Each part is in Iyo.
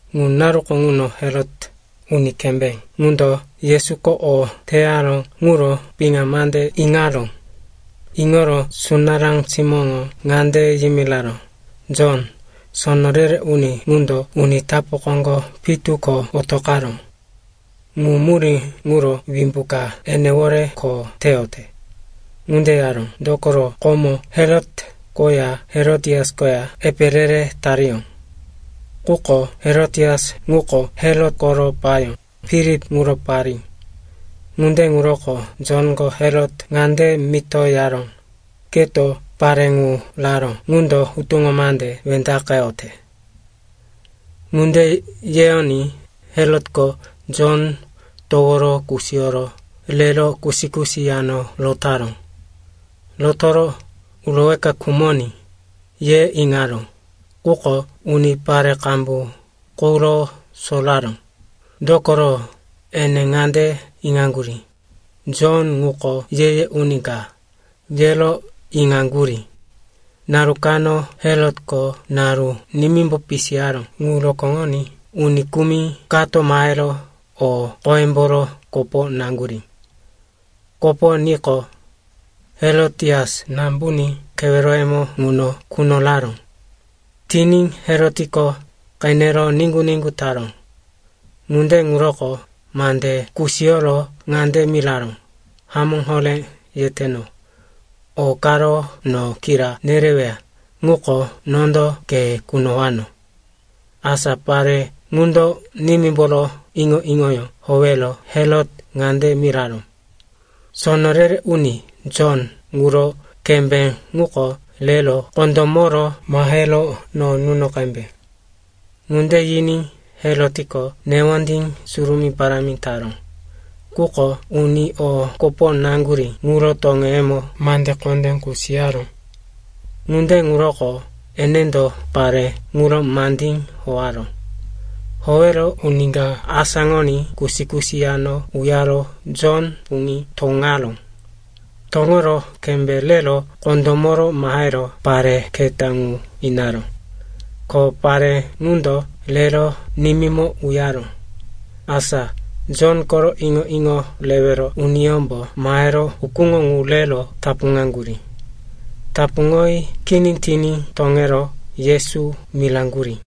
Ŋu naruko ŋuno Herot, uni kembé ŋundo Yesuko o teyaró ŋuro piŋa mande iŋaró. Iŋoro sunará simóŋo ŋande yimiraró, “Jon, sono re-re uni ŋundo uni tapu koŋgo pitu ko otoqaró. Ŋu murí ŋuro wimbu ka enewore kho teyote.” Ŋunde yaró, dokoro komo Herot koya Herotias koya epe re-re tariyó. Quko Herotias ŋuko Herot koro payó Filip ŋuro parí. Ŋunde ŋuroko Jonko Herot ŋande mito yaró, “Keto pare ŋu raró ŋundo hutuŋo mande wendaqeyote.” Ŋunde yeyoní Herotko Jon toworo kusiyoro rero kusi-kusi yano rotaró. Rotoro, uroweka khumoní, ye iŋaró, quko unipare qambu quro soraró, dokoro, ene ŋande iŋaŋgurí, Jon ŋuko ye-ye uni ka, yero iŋaŋgurí. Naru kano Herotko naru nimímbo pisiyaró ŋu rokóŋoní uni kumi kato mahero o qoyemboro kopo naŋgurí. Kopo niqo, Herotias nambuní keweroyemo ŋuno qunoraró. Tiní Herotko qenero niŋgu-niŋgu taró. Ŋunde ŋuroko mande kusiyoro ŋande miraró, “Hamó horé yeteno, o karo no kira nereweya ŋuko, nondo ke kunowano.” Asa pare ŋundo nimímboro iŋo-iŋoyó howero Herot ŋande miraró, “Sono re-re uni, Jon, ŋuro kembé ŋuko rero kondómoro mahero no nuno qembe.” Ŋunde yiní Herotko newondí surumí parámi taró. Quko uni o kopo naŋgurí ŋuro toŋeyemo mande kondé kusiyaró. Ŋunde ŋuroko enendo pare ŋuro mandí howaró. Howero uni ka asáŋoní kusi-kusi yano uyaro Jon puŋí toŋaró. Toŋoro kembé rero kondómoro mahero pare keta ŋu inaró. Ko pare ŋundo rero nimímo uyaró. Asa Jon koro iŋo-iŋo rewero uniyómbo mahero ukúŋo ŋu rero tapuŋaŋgurí. Tapuŋoyi kini tiní toŋero Yesu miraŋgurí.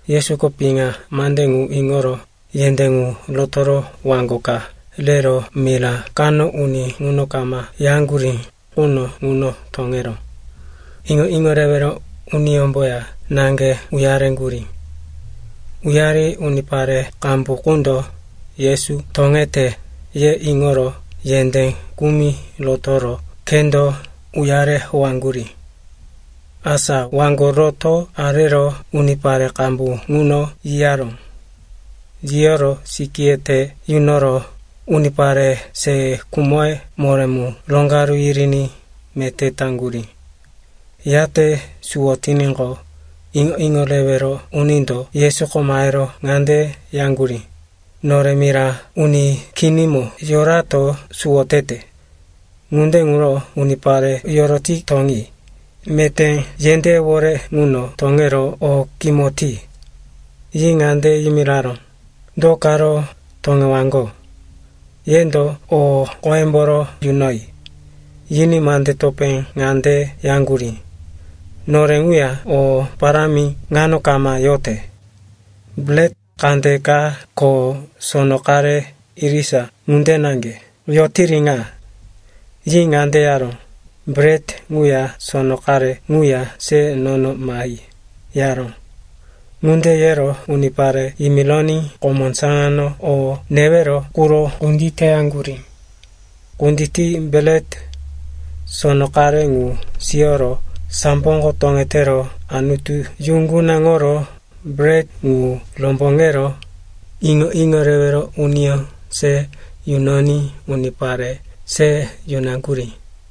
Yesuko piŋa mande ŋu iŋoro yendé ŋu rotoro waŋgo ka rero mira kano uni ŋuno kama yaŋgurí quno ŋuno toŋeró. Iŋo-iŋo rewero uniyómboya naŋge uyareŋgurí. Uyari unipare qambu qundo, Yesu toŋete, ye iŋoro yendé kumi rotoro khendo uyare howaŋgurí. Asa waŋgo roto arero unipare qambu ŋuno yiyaró. Yiyoro sikíye te yunoro unipare se khumoye moré mu roŋgaru yiriní meté taŋgurí. Yate suwo tiníqo, iŋo-iŋo rewero unindo Yesuko mahero ŋande yaŋgurí, “Nore mira uni kinimo yorato suwo tete. Ŋunde ŋuro unipare yoroti toŋi. Meté yendéwore ŋuno toŋero o kimo ti.” Yi ŋande yimiraró, “Do karo toŋewaŋgo? Yendo o qoyemboro yunoyi.” Yiní mande topé ŋande yaŋgurí, “Nore ŋuya o parámi ŋano kama yote. Bret kandeka ko sono qare irisa ŋunde naŋge yotiri ŋa.” Yi ŋande yaró, “Bret ŋuya sono qare ŋuya se nono mahi,” yaró. Ŋunde yero unipare yimironí komó saŋano o newero quro kunditeyaŋgurí. Kunditi bret, sono qare ŋu siyoro samboko toŋetero Anutu yuŋgunaŋoro bret ŋu romboŋero iŋo-iŋo rewero uniyó se yunoní unipare se yunaŋgurí.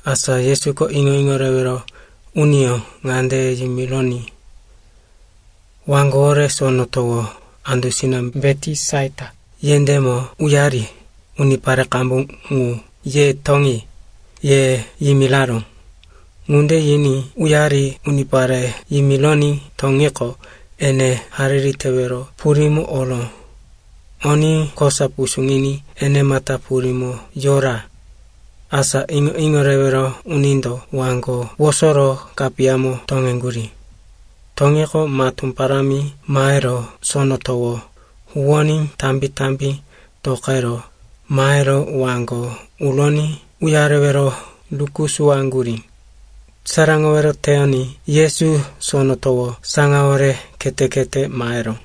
Asa Yesuko iŋo-iŋo rewero uniyó ŋande yimironí waŋgowore sono towo andusina Betisaita yendémo uyari unipare qambu ŋu “Ye toŋi,” ye yimiraró. Ŋunde yiní uyari unipare yimironí toŋiqo, ene hariri tewero purímo oró. Oní kosa pusuŋiní enemata purímo yora. Asa iŋo-iŋo rewero unindo waŋgo wosoro kapiyamo toŋeŋgurí. Toŋiqo, matú parámi mahero sono towo huwoní tambi-tambi toqero mahero waŋgo uroní uyarewero rukusuwaŋgurí. Saraŋowero teyoní Yesu sono towo saŋawore khete-khete maheró.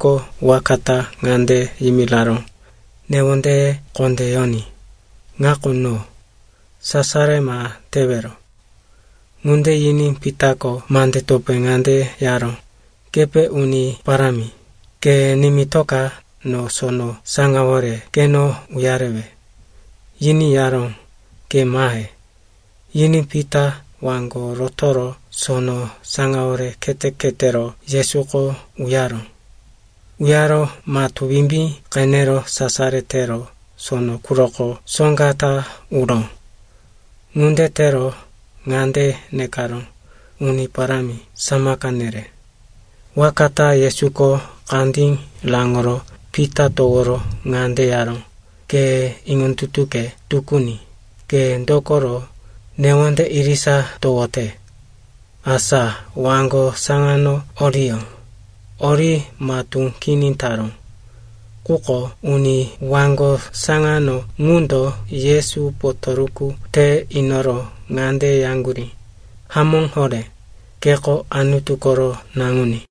Quko Yesuko waka ta ŋande yimiraró, “Newondeye kondé yoní. Ŋako no. Sasaro ma tewero.” Ŋunde yiní Pitako mande topé ŋande yaró, “Kepe Uni Parámi, ke nimitoka no sono saŋawore keno uyarewe.” Yiní yaró, “Ke mahe.” Yiní Pita waŋgo rotoro sono saŋawore khete-khetero Yesuko uyaró. Uyaro matú wimbí qenero sasaro tero sono quroko soŋga ta uró. Ŋunde tero ŋande nekaró, “Uni Parámi, samaka nere.” Waka ta Yesuko kandí raŋoro Pita toworo ŋande yaró, “Ke iŋondutuke tukuni, ke dokoro newonde irisa towote?” Asa waŋgo saŋano oriyó. Ori matú kini taró. Quko uni waŋgo saŋano ŋundo Yesu potoruku te inoro ŋande yaŋgurí, “Hamó horé, keko Anutu koro Naŋuní.”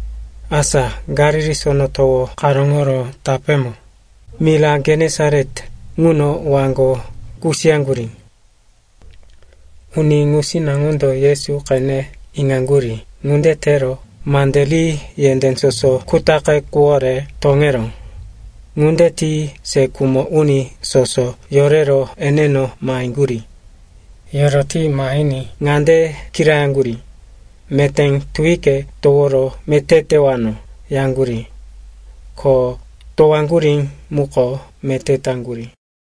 Asa Galili Sono Towo karóŋoro tapémo, mira Genesaret ŋuno, waŋgo kusiyaŋgurí. Uni ŋusina ŋundo Yesu qene iŋaŋgurí, ŋunde tero mande ri yendé soso kutaqe quwore toŋeró. Ŋunde ti se khumo uni soso yorero eneno maheŋgurí. Yoroti mahiní ŋande kirayaŋgurí, “Meté tuwike toworo meté tewano,” yaŋgurí. Ko towaŋgurí muko meté taŋgurí.